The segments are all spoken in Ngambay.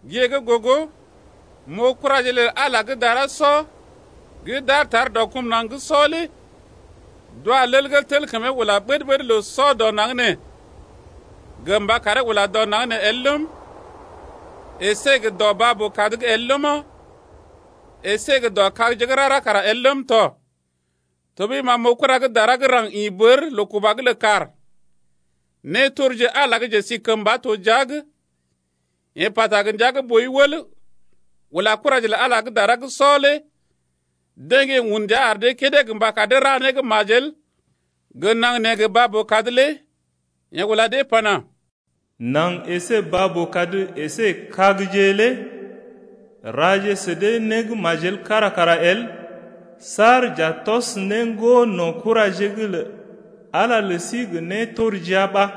Gée gə́ gogo, m’oo kuraje lə Ala gə́ dara sɔ gə́ d’aar tar dɔ kum naŋg gə́ sɔ’g lé d’wa lel gə́ tel kəmee ula ɓəd-ɓəd loo-sɔ dɔ naŋg nee gə mba karee ula dɔ naŋg nee el ləm, əsé gə dɔ baa-boo-kad’g el ləma, əsé gə dɔ kagje gə́ rara kara el ləm tɔ. Tɔɓəi ma m’oo kura gə́ dara gə́ raŋg gə́ ḭ bər loo-kuba’g lə kàr, nétorji Ala gə́ njesikəmba to jia’g. Yeḛ pata gə ndia gə́ boi wəl ula kuraje lə Ala gə́ dara gə́ sɔ lé deḛ gə́ yeḛ un ndia ar dee kédé gə mba kar dee ra né g majel gə naŋg nee gə baa-boo-kad lé. Yeḛ ula dee pana: Naŋg əsé baa-boo-kad əsé kagje lé raje sə dee né gə́ majel kára kara el saar j’a tɔs né ŋgono̰ kuraje’g lə Ala lə sí gə nétorjia ɓa.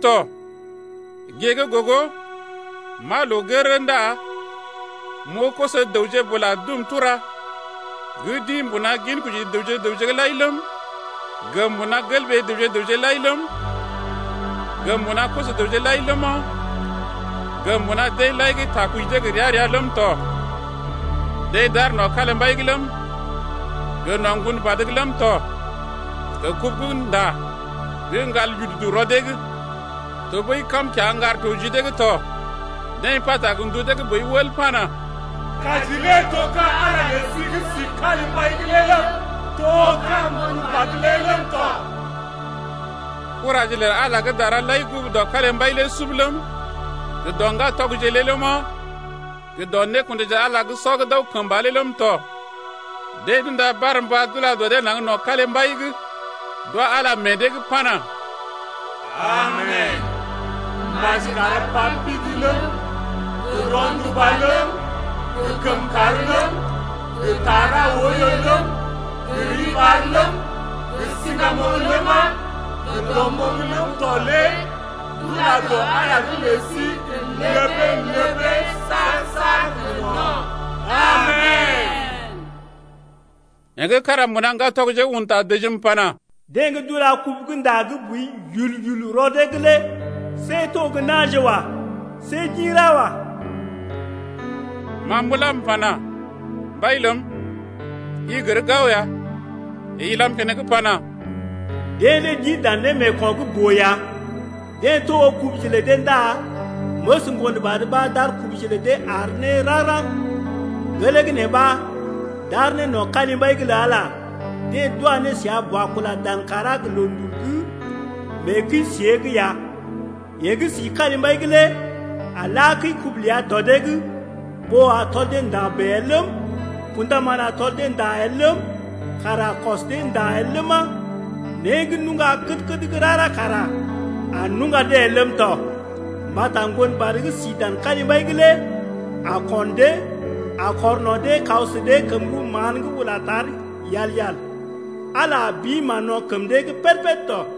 tɔ. 9Gée gə́ gogo m’aa loo gərərə ndá m’oo koso-dəwje bula dum tura gə́ d’ḭ d’ḭ mbuna ginkoji dəwje gə raŋg’g lai ləm, gə mbuna gelɓee dəwje-dəwje’g lai ləm, gə mbuna koso-dəwje lai ləma, gə mbuna deḛ lai gə́ takɔji dee gə́ gə ria-ria ləm tɔ. Deḛ d’aar no̰ kalimbai’g ləm, gə no̰ Ŋgonbad’g ləm tɔ gə kubu gə́ nda gə́ ŋgal yududu rɔ dee’g tɔɓəi kam kiaŋgar to ji dee’g tɔ. 10Deḛ pata gə ndu dee gə́ boi wəl pana: Kaji lé to ka̰ Ala lə sí gə́ si kalimbai’g lé ləm, to ka̰ Ŋgonbad lé ləm tɔ. 11Kuraje lə Ala gə́ dara lai gugu dɔ kalimbai lé sub ləm, gə dɔ ŋgatɔgje lé ləma, gə dɔ nékundaje lə Ala gə́ sɔ gə́ d’aw kəmba lé ləm tɔ. Deḛ d’unda barmba d’ula dɔ dee naŋg no̰ kalimbai’g, d’wa Ala meḛ dee’g 12pana: Amen! maji kar pa pidi ləm, gə rɔnduba ləm, gə kəmkàr ləm, gə ta ra oiyo ləm, gə riɓar ləm, gə siŋgamoŋ ləma, gə dɔmoŋ ləm tɔ lé d’ula dɔ Ala lə sí gə ləbee-ləbee saar-saar gə no̰. Amen! Yeḛ gə́ kára mbuna ŋgatɔgje’g un ta dəjim pana: Deḛ gə́ d’ula kubu gə́ nda gə́ boi yul-yul rɔ dee’g lé see to gə́ na̰je wa. See d’ḭ ra wa. Ma m’ula m’pana: Mbai ləm, i gər gao ya. Yeḛ ilam keneŋ pana: Deḛ lé d’ḭ dan némeeko̰ gə́ boo ya, deḛ togo kubuje lə dee ndá məs Ŋgonbad ɓa d’ar kubuje lə dee àr ne raŋg-raŋg. Gelee gə́ nee ɓa d’aar ne no̰ kalimbai’g lə Ala, deḛ d’wa ne səa bua kula dan kàrá gə loondul’g mee kəi-siée’g ya. Yeḛ gə́ si kalimbai’g lé a la kəi-kubu ləa dɔ dee’g. Ɓó a tɔl dee nda̰ bèe el ləm, kṵdaman a tɔl dee nda̰ el ləm, kàr a kɔs dee nda̰ el ləma, né gə́ nuŋga kəd-kəd gə́ rara kara a nuŋga dee el ləm tɔ. Mbata Ŋgonbad gə́ si dan kalimbai’g lé a ko̰ dee, a kɔr no̰ dee kaw sə dee kəm-rəw-mán gə́ ula tar yal-yal. Ala a bi mán-no̰ kəm dee’g pəd-pəd tɔ.